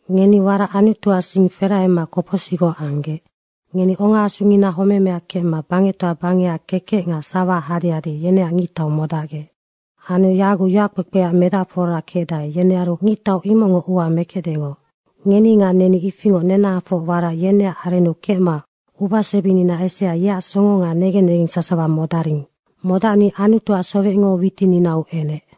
Ngeni warac Anutuac sing ferahema kopocsicgoc amma ongaasungina homemea kecma bangectoa bangecac kekec nga sawaac hadehade yeneac ngictau modacgec. Anu yaguc yoackpekpeac medacfora kecdae, yenearu ngictau imocngo ua mekecdengoc. Ngeni nga neni ifingoc nenahafoc warac yeneac arennu kecma ubasebinina esea yeac songo nga negen negeng sasawa modaring. Modacni Anutuac sowecngo witininau enec.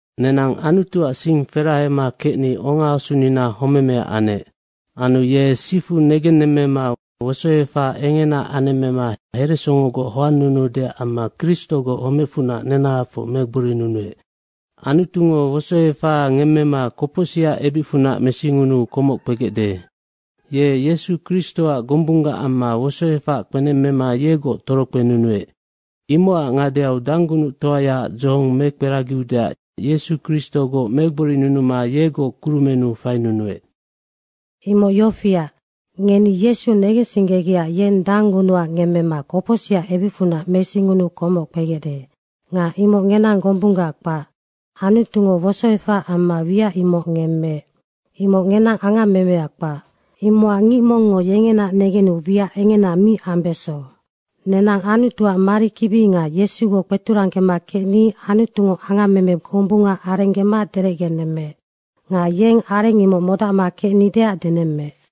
Nenang Anutuac sing ferahema kecni ongaasunina homemea anec. Anu ye sifu negennemmema wosoefaha engena anemmema heresongogoc hoannunudeac amma Kristogoc homecfunac nenahafoc megborinunuec. Anutungo wosoefaha ngemmema kopocsicac ebicfunac mesingunuu komoc kpegecde. Ye Yesu Kristoac gombunggac amma wosoefac kpenemmema yegoc torokpenunuec. Imocac ngadeau danggunuctoayaac dzohong mekperagiudeac Yesu Kristogoc megborinunuma yegoc kurumennu fainunuec. Imoc yofiac, ngeni Yesu negensinggegecac yeng danggunuha ngemmema kopocsicac ebicfunac mesingunuu komoc kpegecde. Nga imoc ngenang gombunggac kpac. Anutungo wosoefahaac amma wiac imoc ngemmeec. Imoc ngenang angammemeac kpac. Imocac ngic mongngo yengenaac negenu wiac engena mi ambeso. Nenang Anutuac marikibi nga Yesugoc kpeturanggema kecni Anutungo angammeme gombunga arenggema derecgenemmeec. Nga yeng areng imoc modacma kecnideac denemmeec.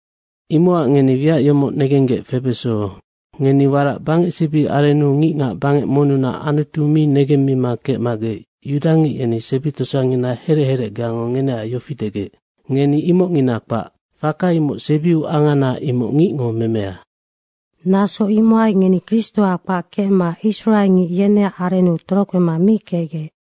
Imocac ngeni wiac yomoc negenggec febeso, ngeni warac bangecsebi arennu ngicngac bangec monnunac Anutu mi negemmima kecmagec yudangic yeni sebi tosangina herec herecgeango ngeneac yofi degec, “Ngeni imocngina kpac.” Faka imoc sebiu angana imoc ngicngo memea. Naso imohai ngeni Kristoa kpac kecma israengic yeneac arennu torokpema mi kecgec.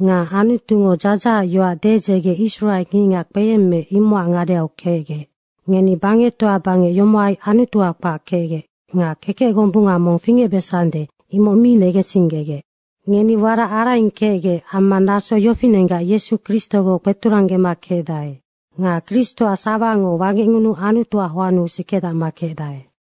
Nga Anutungo dzadzahacac yoac dedzege israengicngac kpeyemmeec, imocac ngadeau kecgec. Ngeni bangectoa bangec yomohai Anutua kpac kecgec nga kekec gombunga mong fingecbesande, imoc mi negensinggegec. Ngeni warac araing kecgec amma naso yofinenggac Yesu Kristogoc kpeturanggema kecdae. Nga Kristoac sawango wangecngunuu Anutuac hoannu sikedacma kecdae.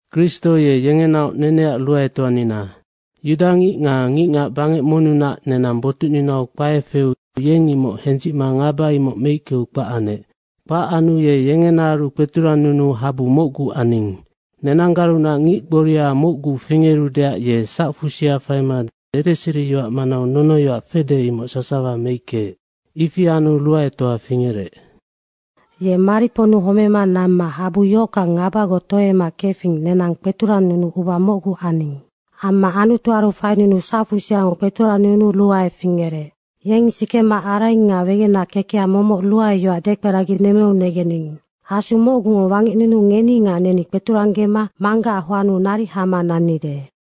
Kristo ye yengenaoc neneac ruaetoanina. Yudangic nga ngicngac bangec monnunac, nenang botucninau kpae feu yeng imoc hendzicma ngaba imoc meickeu kpac anec. Kpac anu ye yengenaaru kpeturannunuu habu mocgu aning. Nenanggarunac ngic gboria mocgu fingerudeac ye sacfusia faima dedeseriyoac manau nonoyoac fede, imoc sasawa meickeec. Ifi anu ruaetoa fingerec. Ye mariponnu homema namma habu yohockang ngabagoc tohoemema kefing, nenang kpeturannunuu uba mocgu aning. Amma Anutuaru fainunuma sacfusiango kpeturannunuu ruae fingerec. Yeng sikema araing nga wegenac kekeha momoc ruaeyoac dekperaginemmeu negening. Asu mocgungo wangecnunuu ngeni nga neni kpeturanggema Manggacac hoannu naric hama nannide.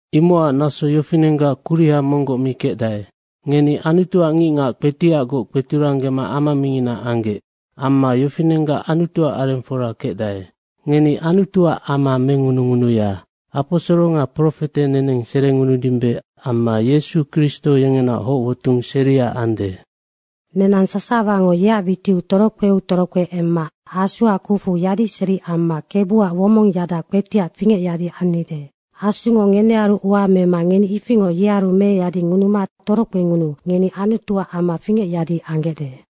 Imocac naso yofinenggac kuriha monggoc mi kecdae. Ngeni Anutuac ngicngac kpetiacgoc kpeturanggema ama mingina anggec. Amma yofinenggac Anutuac arengfora kecdae. Ngeni Anutuac ama mengunungunuya. Aposoro nga profete neneng serengunudimbe amma Yesu Kristo yengenaoc hocwotung seria ande. Nenang sasawango yeac witiu torokpeu torokpe emma Asuac kucfu yadiseri amma Kebuac womongyada kpetiac fingecyadi annide. Asungo ngenearu ua mema ngeni ifingoc yearu meyadingunuma torokpengunuu ngeni Anutuac ama fingecyadi anggecde.